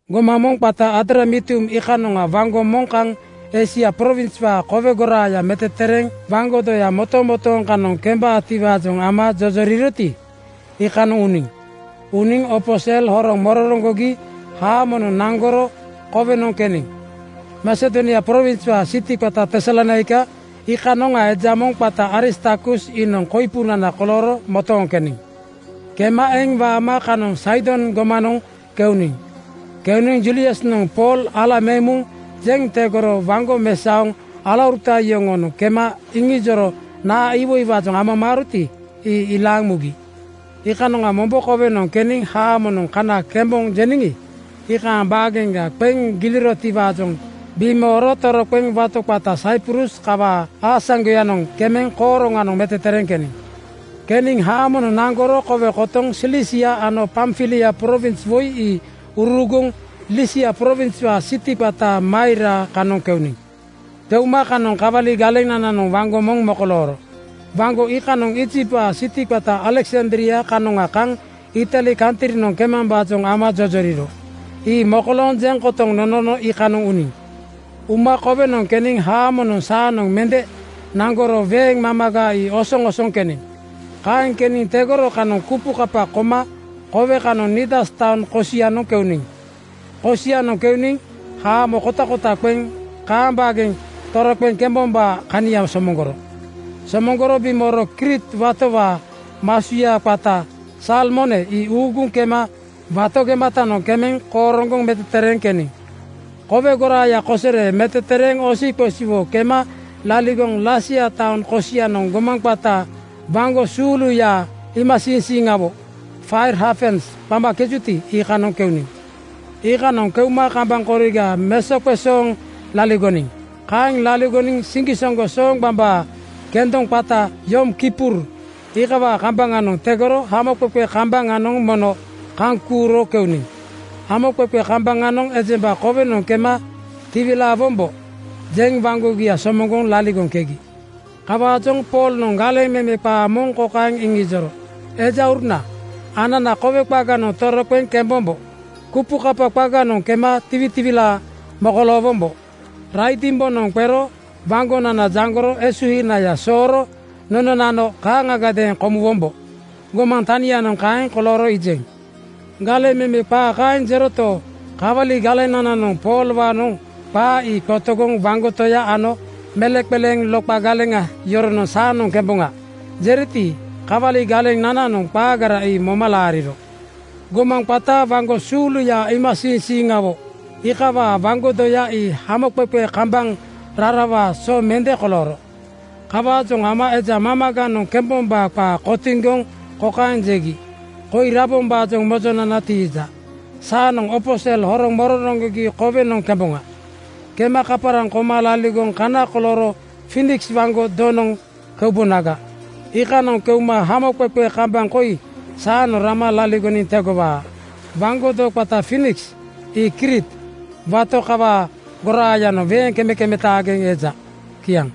Gomaŋ moŋ qata Adramitium iikanoŋa waŋgo moŋ kaŋ Eisia prowinswaa kowe goraaya metetereeŋ waŋgo doya motomotooŋ kanoŋ kembaatiwaajoŋ ama jojoriroti, iikanoŋ uniŋ. Uniŋ opo sel horoŋ mororoŋgogi haamonoŋ naŋgoro kowenoŋ keniŋ. Masedonia prowinswaa siti qata Tesalonaika iikanoŋa eja moŋ qata Aristarkus iinoŋ koipunana kolooro motooŋ keniŋ. Kema eŋ waama kanoŋ Saidon gomanoŋ keuniŋ. Keuniŋ Juliusnoŋ Pool ala meŋ muŋ jeŋ tegoro waŋgo mesaoŋ alauruta yoŋoonoŋ kema iŋiiro naa iwoiwaajoŋ amamaaroti, ii ilaaŋ mugi. Iikanoŋa mombo kowenoŋ keniŋ haamonoŋ kana kemboŋ jeniŋi, iikaaŋ baageŋga qeŋ gilirotiwaajoŋ bimooro toroqeŋ wato qata Saiprus kawaa aasaŋgoyanoŋ kemeŋ kooroŋgoŋ metetereeŋ keniŋ. Keniŋ haamonoŋ naŋgoro kowe kotoŋ Silisia ano Pamfilia prowins woi ii uruuguŋ Lisia prowinswaa siti qata Maira kanoŋ keuniŋ. Keuma kanoŋ kawali galenananoŋ waŋgo moŋ mokolooro. Waŋgo iikanoŋ Iijiptwaa siti qata Aleksandria kanoŋa kaŋ Itali kantrinoŋ kemambaajoŋ ama jojoriro. Ii mokolooŋ jeŋ kotoŋ nonono iikanoŋ uniŋ. Uma kowenoŋ keniŋ haamonoŋ saanoŋ mende naŋgoro weeŋ mamaga ii osoŋosoŋ keniŋ. Kaeŋ keniŋ tegoro kanoŋ kupukapa koma kowe kanoŋ Nidas taoŋ kosianoŋ keuniŋ. Kosianoŋ keuniŋ haamo kotakota qeŋ kaaŋ baageŋ toroqeŋ kembombaa kania somoŋgoro. Somoŋgoro bimooro Kriit watowaa masuya qata Salmone ii uuguŋ kema wato gematanoŋ kemeŋ kooroŋgoŋ metetereeŋ keniŋ. Kowe goraaya kosere metetereeŋ osiqosiwo kema laligoŋ Lasea taoŋ kosianoŋ gomaŋ qata “Waŋgo suuluya iimasiiŋsiiŋawo, Fair Hafens” qamakejuti, iikanoŋ keuniŋ. Iikanoŋ keuma kambaŋ koriga mesoqesooŋ laligoniŋ. Kaeŋ laligoniŋ siŋgisoŋgo sooŋgbambaa kendoŋa qata Yom Kippur iikawaa kambaŋanoŋ tegoro haamoqeqe kambaŋanoŋ mono kaŋ kuuro keuniŋ. Haamoqeqe kambaŋanoŋ ejemba kowenoŋ kema “Tiwilaawombo,” jeŋ waŋgogia somoŋgoŋ laligoŋkegi. Kawaajoŋ Poolnoŋ galeŋ meme qaa moŋ kokaeŋ iŋijoro, “Ejauruna, anana kowe qaganoŋ toroqeŋ kembombo. Kupukapa qaganoŋ kema tiwitiwilaa mokoloowombo. Raidimbonoŋ qero waŋgonana jaŋgoro esuhinaya sooro nononano kaaŋagadeeŋ komuwombo. Gomaŋ tanianoŋ kaeŋ kolooro iijeŋ.” Galeŋ meme qaa kaeŋ jeroto, kawali galenananoŋ Poolwaanoŋ qaa ii qotogoŋ waŋgo toya ano meleŋqeleeŋ loqa (steer) galeŋa yoronoŋ “Saanoŋ kemboŋa,” jeriti, kawali galenananoŋ qaagara ii moma laariro. Gomaŋ qata “Waŋgo suuluya iimasiiŋsiiŋawo” iikawaa waŋgo doya ii haamoqeqe kambaŋ rarawaa so mende kolooro. Kawaajoŋ ama eja mamaganoŋ kembombaa qaa kotiŋgoŋ kokaeŋ jegi, “Koi rabombaajoŋ mojonana tiija. Saanoŋ opo sel horoŋ mororoŋgogi kowenoŋ kemboŋa. Kema kaparaŋ koma laligoŋ kana kolooro Fiiniks waŋgo donoŋ keubonaga. Iikanoŋ keuma haamoqeqe kambaŋ koi saanoŋ rama laligoniŋ tegowaa.” Waŋgo do qata Fiiniks ii Kriit wato kawaa goraayanoŋ weeŋ kemekemetaageŋ eja. Kiaŋ.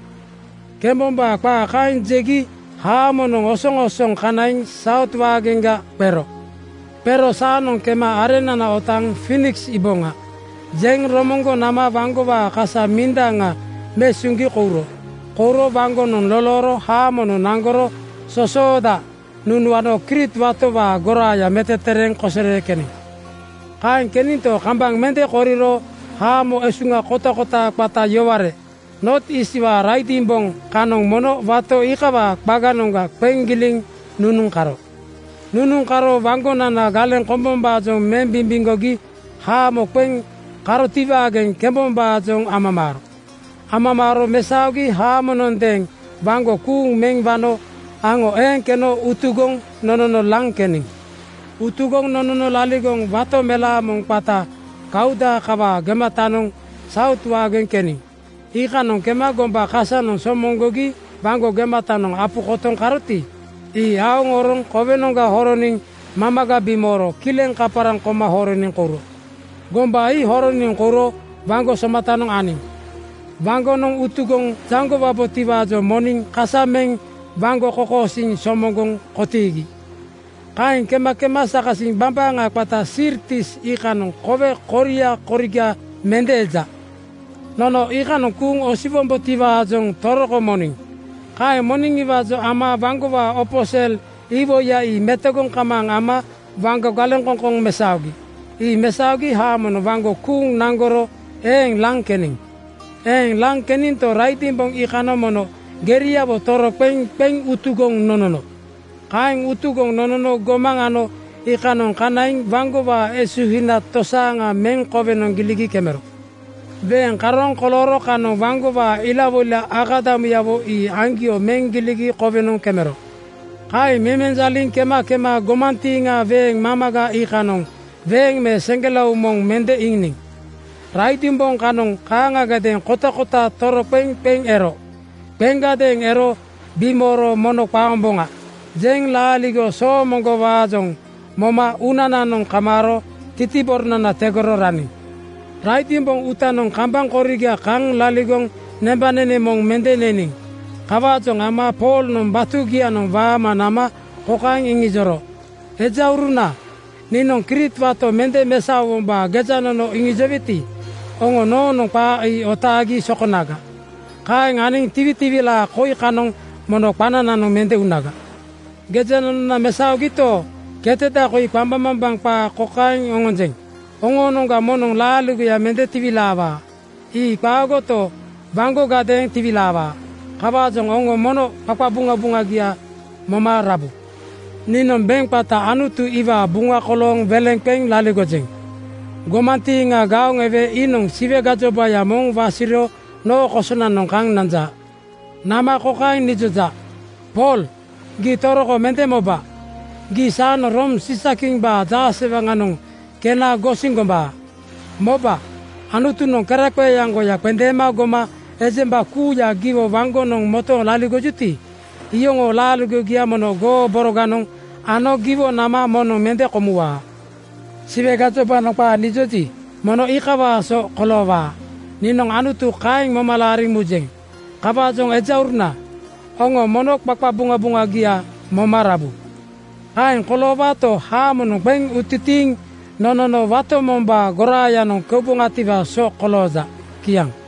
Kembombaa qaa kaeŋ jegi haamonoŋ osoŋosoŋ kanaiŋ Saut waageŋga qero. Qero “Saanoŋ kema areŋnana otaaŋ Fiiniks iiboŋa,” jeŋ romoŋgoŋ nama waŋgowaa kasa mindaŋa mesuŋgi kouro. Kouro waŋgonoŋ lolooro haamonoŋ naŋgoro sosooda nunuano Kriit watowaa goraaya metetereeŋ kosere keniŋ. Kaeŋ keninto, kambaŋ mende koriro haamo esuŋa kotakota qata yoware, Noot Iistwaa raidimboŋ (momosia) kanoŋ mono wato iikawaa qaganoŋga qeŋ giliŋ nunuŋ karo. Nunuŋ karo waŋgonana galeŋ kombombaajoŋ meŋ bimbimgogi haamo qeŋ karotiwaageŋ kemambaajoŋ amamaaro. Amamaaro mesaogi haamonondeeŋ waŋgo kuuŋ meŋ wano aŋo eeŋ keno utugoŋ nonono laŋ keniŋ. Utugoŋ nonono laligoŋ wato melaa moŋ qata Kauda kawaa gematanoŋ Saut waageŋ keniŋ. Iikanoŋ kema gomba kasanoŋ somoŋgogi waŋgo gematanoŋ apu kotoŋ karoti, ii aoŋ oroŋ kowenoŋga horoniŋ mamaga bimooro kileŋ kaparaŋ koma horoniŋ kouro. Gomba ii horoniŋ kouro waŋgo somatanoŋ aniŋ. Waŋgonoŋ utugoŋ jaŋgowabotiwaajoŋ moniŋ kasa meŋ waŋgo kokosiiŋ somoŋgoŋ kotiigi. Kaeŋ kema kema sakasiŋ bambaaŋa qata Sirtis iikanoŋ kowe koria koriga mende eja. Nono iikanoŋ kuuŋ osiwombotiwaajoŋ toroko moniŋ. Kaeŋ moniŋiwaajoŋ ama waŋgowaa opo sel iwoiya ii metogoŋ kamaaŋ ama waŋgo galeŋkoŋkoŋ mesaogi. Ii mesaogi haamonoŋ waŋgo kuuŋ naŋgoro eeŋ laŋ keniŋ. Eeŋ laŋ keninto, raidimboŋ iikanoŋ mono geriawo toroqeŋ qeŋ utugoŋ nonono. Kaeŋ utugoŋ nonono gomaŋ ano iikanoŋ kanaiŋ waŋgowaa esuhina tosaaŋa meŋ kowenoŋ giligi kemero. Weeŋ karooŋ kolooro kanoŋ waŋgowaa ilawoila akadamuyawo ii aŋgio meŋ giligi kowenoŋ kemero. Kaeŋ memenjaliŋ kema kema gomantiiŋa weeŋ mamaga iikanoŋ weeŋ me seŋgelao moŋ mende iiniŋ. Raidimboŋ kanoŋ kaaŋagadeeŋ kotakota toroqeŋ qeŋ ero. Qeŋgadeeŋ ero bimooro “Mono qaomboŋa!” jeŋ laaligo soomoŋgowaajoŋ moma uunananoŋ kamaaro titiboronana tegoro raniŋ. Raidimboŋ uutanoŋ kambaŋ koriga kaŋ laligoŋ nembanene moŋ mende neniŋ. Kawaajoŋ ama Poolnoŋ batugianoŋ waama nama kokaeŋ iŋijoro, “Ejauruna, niinoŋ Kriit wato mende mesaowombaa gejanono iŋijoweti, oŋo noonoŋ qaa ii otaagi sokonaga. Kaeŋ aniŋ tiwitiwilaa koi kanoŋ mono qanananoŋ mende unaga. Gejanonona mesaogito, keteda koi qambaŋmambaŋ qaa kokaeŋ oŋonjeŋ: Oŋoonoŋga moŋnoŋ laaligoya mende tiwilaawaa. Ii qaagoto, waŋgogadeeŋ tiwilaawaa. Kawaajoŋ oŋo mono qaqabuŋabuŋagia moma rabu. “Niinoŋ beŋ qata Anutu iwaa buŋa kolooŋ weleŋa qeŋ laligojeŋ. Gomantiiŋa gaoŋ ewe iinoŋ Siwe gajobaya moŋ wasiro noo kosonanoŋ kaŋ nanja. Nama kokaeŋ nijoja, ‘Pool, gii toroko mende moba! Gii saanoŋ Room Siisakimbaa jaasewaŋanoŋ kena gosiŋ gombaa. Moba! Anutunoŋ keraqeeaŋgoya qendeema goma ejemba kuuya giwo waŋgonoŋ motooŋ laligojuti, iyoŋoo laaligogia mono goo boroganoŋ ano giwo nama moŋnoŋ mende komuwaa.’ Siwe gajobanoŋ qaa nijoji, mono iikawaa so koloowaa. Niinoŋ Anutu kaeŋ moma laariŋ mujeŋ. Kawaajoŋ ejauruna, oŋo mono qaqabuŋabuŋagia moma rabu. Kaeŋ koloowaato, haamonoŋ qeŋ utitiiŋ nonono wato mombaa goraayanoŋ keuboŋatiwaa so kolooja.” Kiaŋ.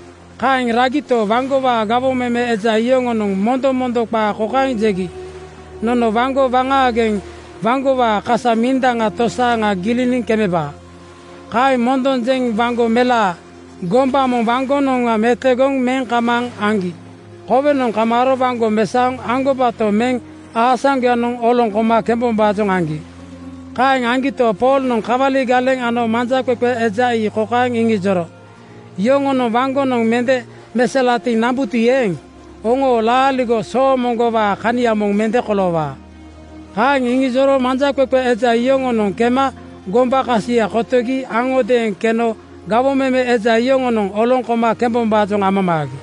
Kaeŋ ragito, waŋgowaa gawoŋ meme eja yoŋonoŋ mondomondo qaa kokaeŋ jegi, “Nono waŋgo waŋaageŋ waŋgowaa kasa mindaŋa tosaaŋa giliniŋ kemebaa.” Kaeŋ mondoŋ jeŋ waŋgo melaa, gomba moŋ waŋgonoŋga metogoŋ meŋ kamaaŋ aŋgi kowenoŋ kamaaro waŋgo mesaoŋ aŋgobato meŋ aasaŋgoyanoŋ oloŋ koma kembombaajoŋ aŋgi. Kaeŋ aŋgito, Poolnoŋ kawali galeŋ ano manjaqeqe eja ii kokaeŋ irijoro, “Yoŋonoŋ waŋgonoŋ mende meselatiŋ nambuti eeŋ, oŋoo laaligo soomoŋgowaa kania moŋ mende koloowaa.” Kaeŋ irijoro manjaqeqe eja yoŋonoŋ kema gombaa kasia kotogi aŋodeeŋ keno gawoŋ meme eja yoŋonoŋ oloŋ koma kembombaajoŋ amamaagi.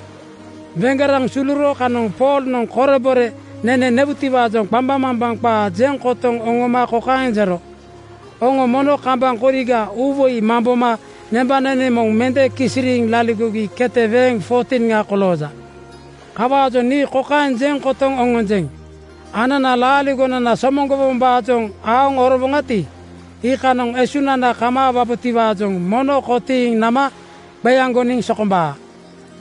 Weŋgeraŋ suluro kanoŋ Poolnoŋ korebore nene newutiwaa qambaŋmambaŋ qaa jeŋ kotoŋ oŋoma kokaeŋ jero, “Oŋo mono kambaŋ koriga uuwoi mamboma nembanene moŋ mende kisiriiŋ laligogi kete weeŋ 14:ŋa kolooja. Kawaajoŋ nii kokaeŋ jeŋ kotoŋ oŋonjeŋ: Anana laaligonana somoŋgowombaajoŋ aoŋ orowoŋati, iikanoŋ esuŋnana kamaawabotiwaajoŋ mono kotiiŋ nama qeaŋgoniŋ sokombaa.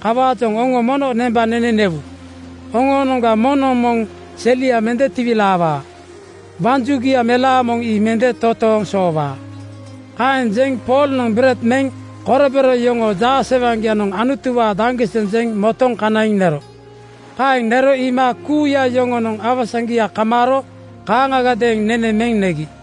Kawaajoŋ oŋo mono nembanene newu. Oŋoonoŋga moŋnoŋ moŋ selia mende tiwilaawaa. Waŋ jugia melaa moŋ ii mende totooŋ soowaa.” Kaeŋ jeŋ Poolnoŋ bered meŋ korebore yoŋoo jaasewaŋgianoŋ Anutuwaa daŋgiseŋ jeŋ motoŋ kanaiŋ nero. Kaeŋ nero iima kuuya yoŋonoŋ awasaŋgia kamaaro kaaŋagadeeŋ nene meŋ negi.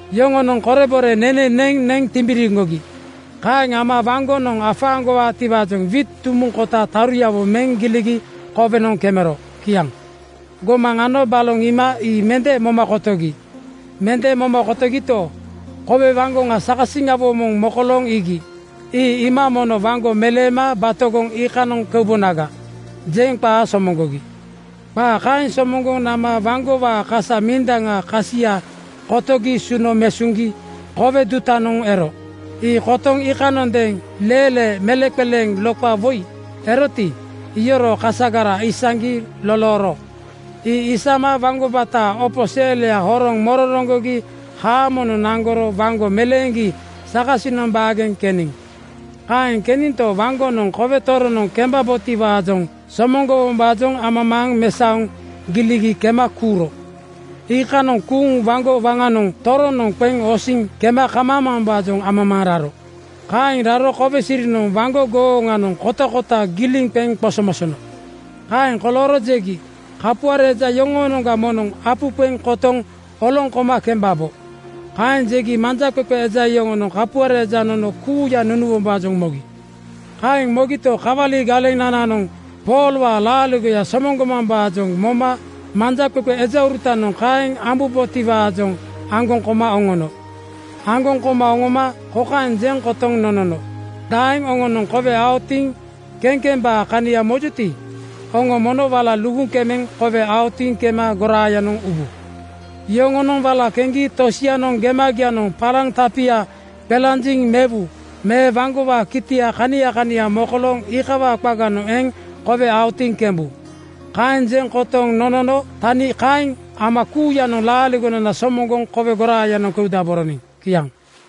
Yoŋonoŋ korebore nene neŋ neŋ timbiriŋgogi. Kaeŋ ama waŋgonoŋ afaaŋgowaatiwaajoŋ wiit dumuŋ kota taruyawo meŋ giligi kowenoŋ kemero. Kiaŋ. Gomaŋ ano baloŋ iima ii mende moma kotogi. Mende moma kotogito, kowe waŋgoŋa (bay) sakasiŋawo moŋ mokolooŋ iigi. Ii iima “Mono waŋgo meleema batogoŋ iikanoŋ keubonaga,” jeŋ qaa somoŋgogi. Qaa kaeŋ somoŋgoŋ nama waŋgowaa kasa mindaŋaa kasia kotogi suno mesaogi kowe dutanoŋ ero. Ii kotoŋ iikanondeeŋ leelee meleŋqeleeŋ (steer) loqa woi eroti, iyoroo kasagara isaŋgi lolooro. Ii isama waŋgo bataa opo selya horoŋ mororoŋgogi haamonoŋ naŋgoro waŋgo meleeŋgi sakasinoŋ baageŋ keniŋ. Kaeŋ keninto, waŋgonoŋ kowe toroŋnoŋ kembabotiwaajoŋ somoŋgowombaajoŋ amamaaŋ mesaoŋ giligi kema kuuro. Iikanoŋ kuuŋ waŋgo waŋanoŋ toroŋnoŋ qeŋ osiŋ kema kamambaajoŋ amamaaŋ raro. Kaeŋ raro kowe sirinoŋ waŋgo gooŋanoŋ kotakota giliŋ qeŋ qosomosono. Kaeŋ kolooro jegi, “Kapuare eja yoŋoonoŋga moŋnoŋ apu qeŋ kotoŋ oloŋ koma kembabo.” Kaeŋ jegi manjaqeqe eja yoŋonoŋ kapuare eja nono kuuya nunuwombaajoŋ mogi. Kaeŋ mogito, kawali galenananoŋ Poolwaa laaligoya somoŋgomambaajoŋ moma manjaqeqe ejaurutanoŋ kaeŋ ambubotiwaajoŋ aŋgoŋ koma oŋono. Aŋgoŋ koma oŋoma kokaeŋ jeŋ kotoŋ nonono, “Daeŋ oŋonoŋ kowe aotiŋ kekembaa kania mojuti, oŋo mono wala luguŋ kemeŋ kowe aotiŋ kema goraayanoŋ ubu. Yoŋonoŋ wala keŋgi tosianoŋ gemagianoŋ palaŋ tapia qelanjiŋ mewu me waŋgowaa kitia kania kania mokolooŋ iikawaa qaganoŋ eŋ kowe aotiŋ kembu.” Kaeŋ jeŋ kotoŋ nonono tani kaeŋ ama kuuyanoŋ laaligonana somoŋgoŋ kowe goraayanoŋ keudaboroniŋ. Kiaŋ.